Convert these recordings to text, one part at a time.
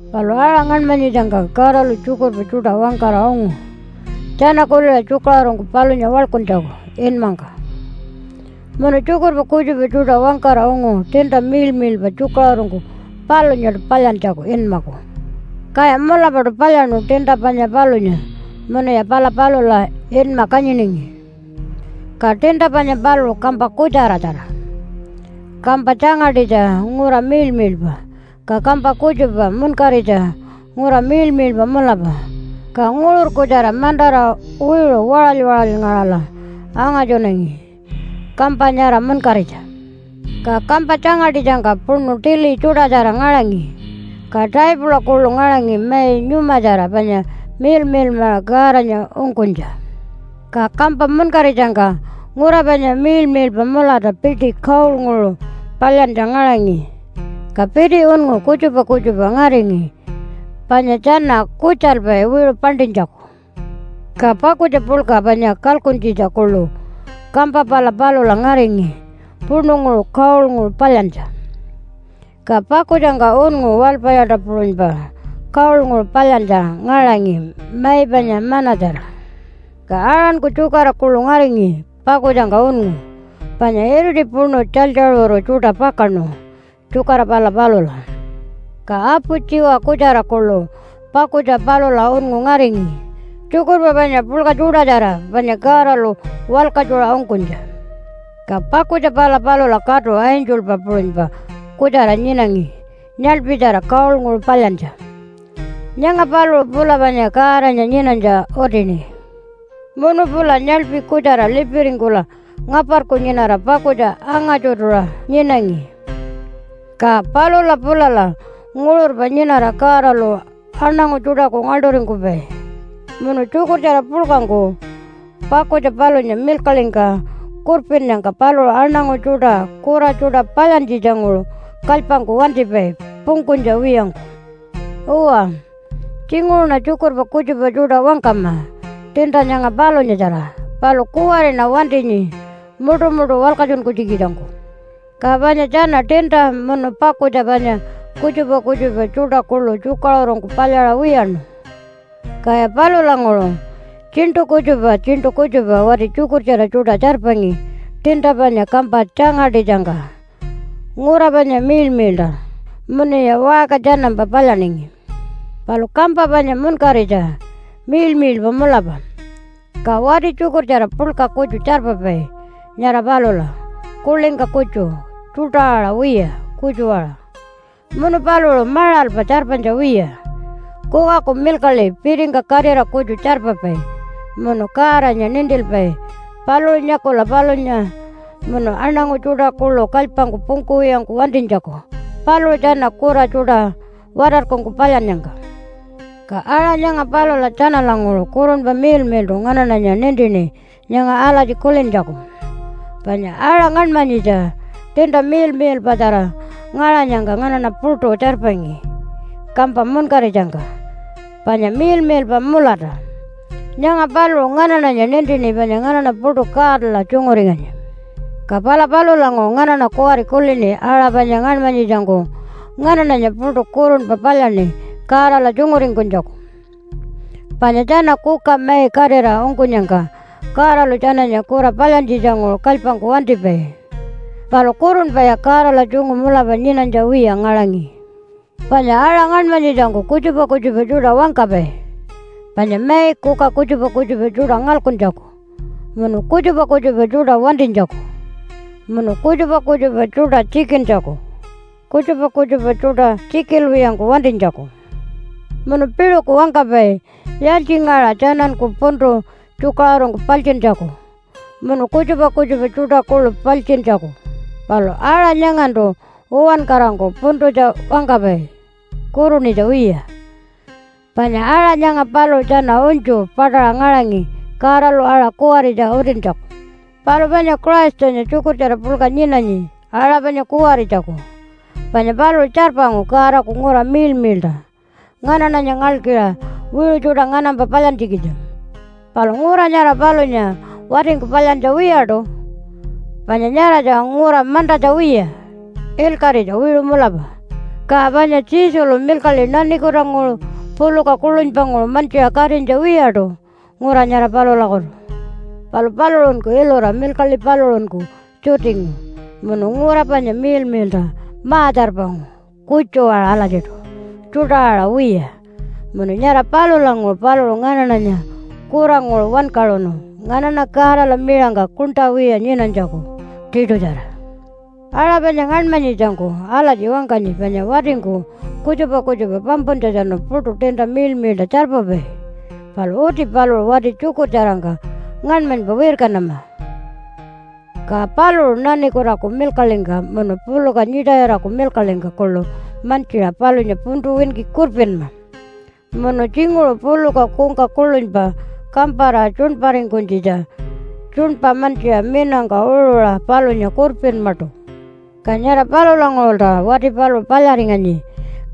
Palu aṟa ngaṉmanyitjangka Godalu tjukurpa tjuṯa wangkara ungu tjana kuliṟa tjukaṟurungku palunya waḻkuntjaku inmangka. Munu tjukurpa kutjupa tjuṯa wangkara ungu tiinta miḻmiḻpa tjukaṟurungku palunyaṯu palyantjaku inmaku. Kaya mulapaṯu palyaṉu tiinta panya palunya munuya pala palula inma kanyiningi. Ka tiinta panya paluṟu kampa kutjaratjara, kampa tjangaṯitja ngura miḻmiḻpa, ka kampa kutjupa munkaritja ngura miḻmiḻpa mulapa, ka nguṟur-kutjara mantara wiṟu waṟaly-waṟalyngaṟala angatjunangi kampa nyara munkaritja. Ka kampa tjangaṯitjangka puṉu tili tjuṯatjara ngaṟangi. Ka taipula kuḻu ngaṟangi mai nyumatjara panya miḻmiḻmaṟa Godanya ungkunytja. Ka kampa munkaritjangka ngura panya miḻmiḻpa mulata piti gold-nguṟu palyantja ngaṟangi. Ka piti unngu kutjupa kutjupa ngaringi panya tjana kutjalpai wiṟu paṉṯinytjaku. Ka pakutja puḻka panya kalkuntjitja kuḻu kampa pala palula ngaringi puṉunguṟu gold-nguṟu palyantja. Ka pakutjangka unngu walpayaṯa puṟunypa gold-nguṟu palyantja ngaṟangi mai panya manna-tjara. Ka Aaronku tjukara kuḻu ngaringi pakutjangka unngu. Panya iriti puṉu tjalytjaṟuru tjuṯa pakaṉu tjukara pala palula. Ka apu tjiwa kutjara kuḻu pakutja palula unngu ngaringi, tjukurpa panya puḻka tjuṯatjara panya Godalu walkatjuṟa ungkunytja. Ka pakutja pala palula katu angelpa puṟunypa kutjara nyinangi nyaḻpitjara gold-nguṟu palyantja. Nyanga paluṟu pula panya Godanya nyinanytja utini. Munu pula nyaḻpi kutjara lipiringkula ngaparku nyinara pakutja anga-tjutuṟa nyinangi. Ka palula pulala nguṟurpa nyinara Godalu aṉangu tjuṯaku ngaḻṯuringkupai, munu tjukurtjara puḻkangku pakutja palunya milkaḻingka kurpinnyangka paluṟu aṉangu tjuṯa kura tjuṯa palyantjitjanguṟu kalypangku wantipai pungkunytja wiyangku. (Uwa, tjinguṟuṉa tjukurpa kutjupa tjuṯa wangkama tiinta nyanga palunyatjara, palu kuwariṉa wantinyi muṯumuṯu walkatjunkunytjikitjangku.) Ka panya tjana tiinta, munu pakutja panya, kutjupa kutjupa tjuṯa kuḻu tjukaṟurungku palyaṟa wiyaṉu. Kaya palulanguṟu tjiṉṯu kutjupa tjiṉṯu kutjupa wati tjukurtjara tjuṯa tjarpangi tiinta panya kampa tjangaṯitjangka, ngura panya miḻmiḻṯa, munuya waṟka tjanampa palyaningi. Palu kampa panya munkaritja miḻmiḻpa mulapa, ka wati tjukurtjara puḻka kutju tjarpapai nyara palula, kuḻingka kutju tjuṯa-aṟa wiya, kutju-aṟa. Munu paluṟu maṟalpa tjarpanytja wiya, kukaku milkaḻi pitingka katira kutju tjarpapai, munu Godanya nintilpai paluṟu nyakula palunya munu aṉangu tjuṯa kuḻu kalypangku pungkuwiyangku wantinytjaku paluṟu tjana kura tjuṯa watarkungku palyannyangka. Ka aṟa nyanga palula tjanalanguṟu Kurunpa Miḻmiḻṯu nganaṉanya nintini nyanga alatji kulintjaku, panya aṟa ngaṉmanyitja tiinta miḻmiḻpatjara ngaṟanyangka nganaṉa puṯu tjarpanyi kampa munkaritjangka panya miḻmiḻpa mulata. Nyanga paluṟu nganaṉanya nintini panya nganaṉa puṯu Godala tjunguringanyi. Ka pala palulanguṟu nganaṉa kuwari kulini aṟa panya ngaṉmanyitjangku nganaṉanya puṯu kurunpa palyaṉi Godala tjunguringkunytjaku. Panya tjana kuka mai katira ungkunyangka Godalu tjananya kura palyantjitjanguṟu kalypangku wantipai, palu kurunpaya Godala tjungu mulapa nyinanytja wiya ngaṟangi. Panya aṟa ngaṉmanytjitjangku kutjupa kutjupa tjuṯa wangkapai, panya mai kuka kutjupa kutjupa tjuṯa ngalkuntjaku munu kutjupa kutjupa tjuṯa wantinytjaku, munu kutjupa kutjupa tjuṯa tjikintjaku, kutjupa kutjupa tjuṯa tjikilwiyangku wantinytjaku. Munu piṟuku wangkapai yaaltjingaṟa tjananku puntu tjukaṟurungku paltjintjaku, munu kutjupa kutjupa tjuṯa kuḻu paltjintjaku. Palu aṟa nyangantu uwankarangku puntutja wangkapai kurunitja wiya, panya aṟa nyanga paluṟu tjana unytju paṯaṟa ngaṟangi Godalu aṟa kuwaritja utintjaku. Palu panya Christanya tjukurtjara puḻka nyinanyi aṟa panya kuwaritjaku. Panya paluṟu tjarpangu Godaku ngura miḻmiḻṯa nganaṉanya ngalkiṟa wiṟu tjuṯa nganampa palyantjikitja. Palu ngura nyara palunya watingku palyantja wiyaṯu, panya nyaratja ngura mantatja wiya, ilkaṟitja wiṟu mulapa. Ka panya Jesulu milkaḻi nanikutanguṟu puluka kuḻunypanguṟu mantjiṟa katinytja wiyaṯu ngura nyara palulakutu. Palu paluṟunku ilura milkaḻi paluṟunku tjutingu, munu ngura panya miḻmiḻṯa ma-tjarpangu kutju-aṟa alatjiṯu, tjuṯa-aṟa wiya, munu nyara palulanguṟu paluṟu nganaṉanya kuranguṟu wankaṟunu nganaṉa Godala miṟangka kuṉṯa wiya nyinanytjaku tiṯutjara. Aṟa panya ngaṉmanyitjangku alatji wangkanyi panya watingku kutjupa kutjupa pampuntjatjanu puṯu tiinta miḻmiḻṯa tjarpapai, palu uti paluṟu wati tjukurtjarangka ngaṉmanypa wirkanama, ka paluṟu nanikutaku milkaḻingka, munu puluka nyiṯayiraku milkaḻingka kuḻu mantjiṟa palunya puntu winki kurpinma, munu tjinguṟu puluka kungka kuḻunypa kampara tjuṉparingkunytjitja tjuṉpa mantjiṟa minangka uṟuṟa palunya kurpinmaṯu. Ka nyara palulanguṟulta wati paluṟu palyaringanyi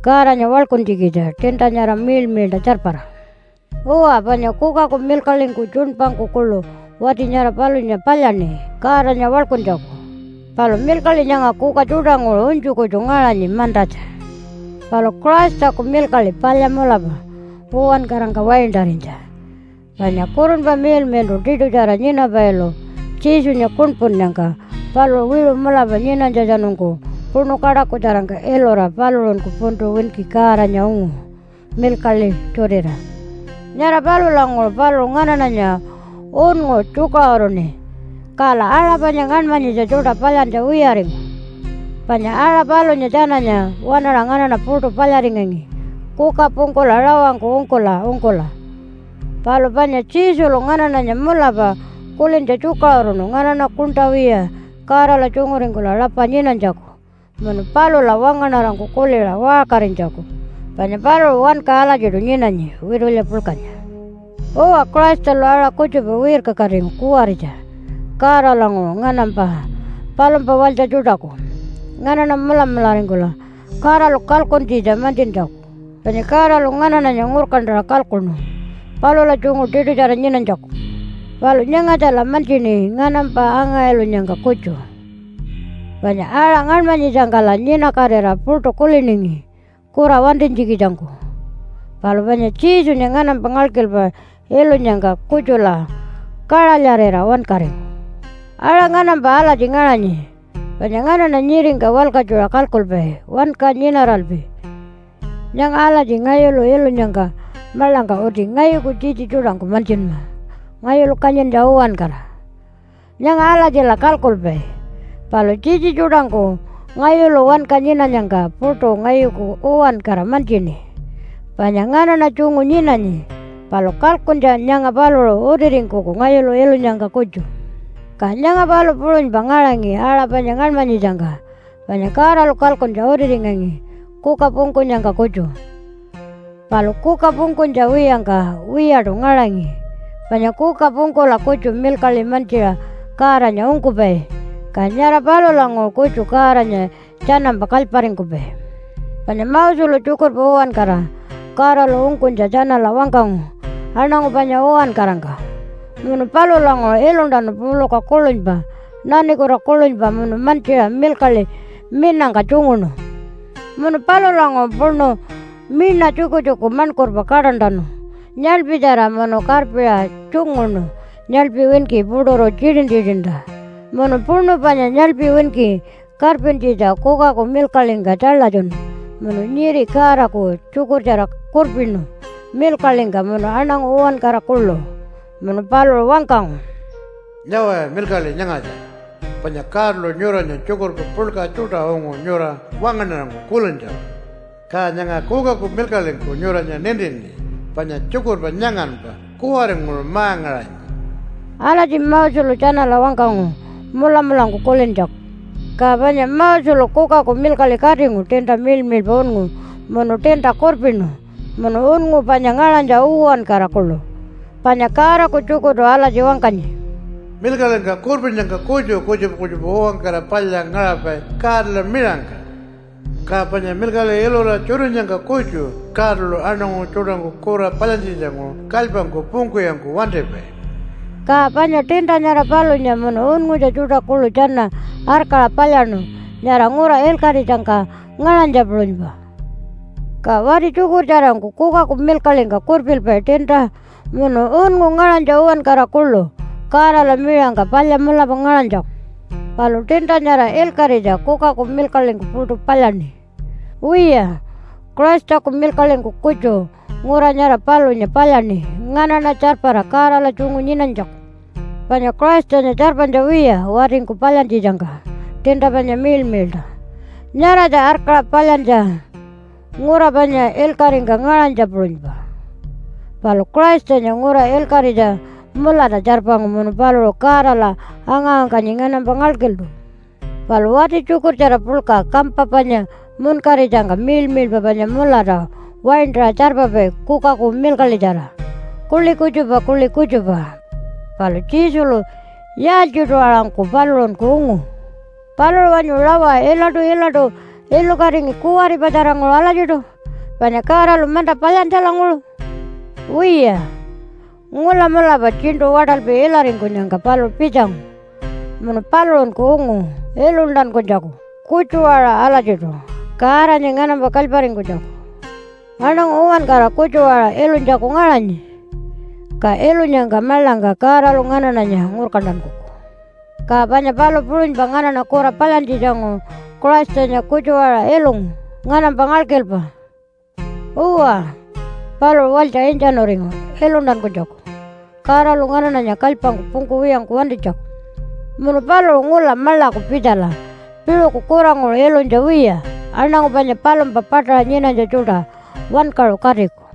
Godanya waḻkuntjikitja tiinta nyara miḻmiḻṯa tjarpara. Uwa, panya kukaku milkaḻingku tjuṉpangku kuḻu wati nyara palunya palyaṉi Godanya waḻkuntjaku. Palu milkaḻi nyanga kuka tjuṯanguṟu unytju kutju ngaṟanyi mantatja. Palu Christaku milkaḻi palya mulapa uwankarangka waintarinytja. Panya Kurunpa Miḻmiḻṯu tiṯutjara nyinapailu Jesunya kuṉpunnyangka paluṟu wiṟu mulapa nyinanytjatjanungku puṉu kaṯakutjarangka ilura paluṟunku puntu winki Godanya ungu milkaḻi tjutira. Nyara palulanguṟu paluṟu nganaṉanya unngu tjukaṟuruṉi, kala aṟa panya ngaṉmanyitja tjuṯa palyantja wiyaringu, panya aṟa palunya tjananya waṉaṟa nganaṉa puṯu palyaringangi kuka pungkula rawangku ungkula ungkula. Palu panya Jesulu nganaṉanya mulapa kulintja tjukaṟuruṉu nganaṉa kuṉṯa wiya Godala tjunguringkula rapa nyinanytjaku munu palula wangaṉarangku kuliṟa waṟkarinytjaku, panya paluṟu wanka alatjiṯu nyinanyi witulya puḻkanya. Uwa, Christalu aṟa kutjupa wirkakatingu kuwaritja Godalanguṟu nganampa palumpa walytja tjuṯaku, nganaṉa mulamularingkula Godalu kalkuntjitja mantjintjaku. Panya Godalu nganaṉanya ngurkantaṟa kalkuṉu palula tjungu tiṯutjara nyinanytjaku. Palu nyangatjala mantjini nganampa anga-ilunyangka kutju. Panya aṟa ngaṉmanyitjangkala nyinakatira puṯu kuliningi kura wantinytjikitjangku, palu panya Jesunya nganampa ngalkilpa ilunyangka kutjula kaṟalyarira wankaringu. Aṟa nganampa alatji ngaṟanyi, panya nganaṉa nyiringka walkatjuṟa kalkulpai wanka nyinaralpi nyanga alatji ngayulu ilunyangka maḻangka uti ngayuku tjitji tjuṯangku mantjinma ngayulu kanyintja uwankara. Nyanga alatjila kalkulpai. Palu tjitji tjuṯangku ngayulu wanka nyinanyangka puṯu ngayuku uwankara mantjini panya nganaṉa tjungu nyinanyi, palu kalkuntja nyanga paluṟu utiringkuku ngayulu ilunyangka kutju. Ka nyanga palu puṟunypa ngaṟangi aṟa panya ngaṉmanyitjangka, panya Godalu kalkuntja utiringangi kuka pungkunyangka kutju, palu kuka pungkunytja wiyangka wiyaṯu ngaṟangi. Panya kuka pungkula kutju milkaḻi mantjiṟa Godanya ungkupai, ka nyara palulanguṟu kutju Godanya tjanampa kalyparingkupai. Panya Moselu tjukurpa uwankara Godalu ungkunytja tjanala wangkangu aṉangu panya uwankarangka. Munu palulanguṟu iluntanu puluka kuḻunypa, nanikuta kuḻunypa munu mantjiṟa milkaḻi minangka tjunguṉu. Munu palulanguṟu puṉu miṉa tjukutjuku maṉkurpa kaṯantanu nyaḻpitjara munu karpiṟa tjunguṉu nyaḻpi winki puṯuru tjitin-tjitinta. Munu puṉu panya nyaḻpi winki karpintjitja kukaku milkaḻingka tjaḻatjunu munu nyiri Godaku tjukurtjara kurpinu milkaḻingka, munu aṉangu uwankara kuḻu. Munu paluṟu wangkangu, “Nyawaya milkaḻi nyangatja, panya Godalu nyuranya tjukurpa puḻka tjuṯa ungu nyura wangaṉarangku kulintjaku. Ka nyanga kukaku milkaḻingku nyuranya nintini panya tjukurpa nyanganpa kuwaringuṟu ma-ngaṟanyi.” Alatji Moselu tjanala wangkangu mulamulangku kulintjaku. Ka panya Moselu kukaku milkaḻi katingu tiinta miḻmiḻpa unngu munu tiinta kurpinu munu unngu panya ngaṟanytja uwankara kuḻu. Panya Godaku tjukurtu alatji wangkanyi, “Milkaḻingka kurpinnyangka kutju kutjupa kutjupa uwankara palya ngaṟapai Godala miṟangka. Ka panya milkaḻi ilura tjutinyangka kutju Godalu aṉangu tjuṯangku kura palyantjitjanguṟu kalypangku pungkuwiyangku wantipai.” Ka panya tiinta nyara palunya munu unngutja tjuṯa kuḻu tjana arkaṟa palyaṉu nyara ngura ilkaṟitjangka ngaṟanytja puṟunypa. Ka wati tjukurtjarangku kukaku milkaḻingka kurpilpai tiinta munu unngu ngaṟanytja uwankara kuḻu Godala miṟangka palya mulapa ngaṟanytjaku. Palu tiinta nyara ilkaṟitja kukaku milkaḻingku puṯu palyaṉi. Wiya, Christaku milkaḻingku kutju ngura nyara palunya palyaṉi nganaṉa tjarpara Godala tjungu nyinanytjaku. Panya Christanya tjarpanytja wiya watingku palyantjitjangka tiinta panya miḻmiḻṯa. Nyaratja arkaṟa palyantja ngura panya ilkaṟingka ngaṟanytja puṟunypa. Palu Christanya ngura ilkaṟitja mulata tjarpangu munu paluṟu Godala anga-wangkanyi nganampa ngalkiltu. Palu wati tjukurtjara puḻka kampa panya munkaritjangka miḻmiḻpa panya mulata waintaṟa tjarpapai kukaku milkaḻitjara kuḻi kutjupa kuḻi kutjupa. Palu Jesulu yaaltjiṯu aṟangku paluṟunku ungu? Paluṟu wanyu rawa ilaṯu-ilaṯu ilukatingi kuwaripatjaranguṟu alatjiṯu panya Godalu manta palyantjalanguṟu? Wiya, ngula mulapa tjiṉṯu waṯalpi ilaringkunyangka paluṟu pitjangu munu paluṟunku ungu iluntankunytjaku kutju-aṟa alatjiṯu Godanya nganampa kalyparingkunytjaku. Aṉangu uwankara kutju-aṟa ilunytjaku ngaṟanyi. Ka ilunyangka maḻangka Godalu nganaṉanya ngurkantankuku. Ka panya palu puṟunypa nganaṉa kura palyantjitjanguṟu Christanya kutju-aṟa ilungu nganampa ngalkilpa. Uwa, paluṟu walytja intjanuringu iluntankunytjaku Godalu nganaṉanya kalypangku pungkuwiyangku wantinytjaku. Munu paluṟu ngula maḻaku pitjala piṟuku kuranguṟu ilunytja wiya aṉangu panya palumpa paṯaṟa nyinanytja tjuṯa wankaṟu katiku.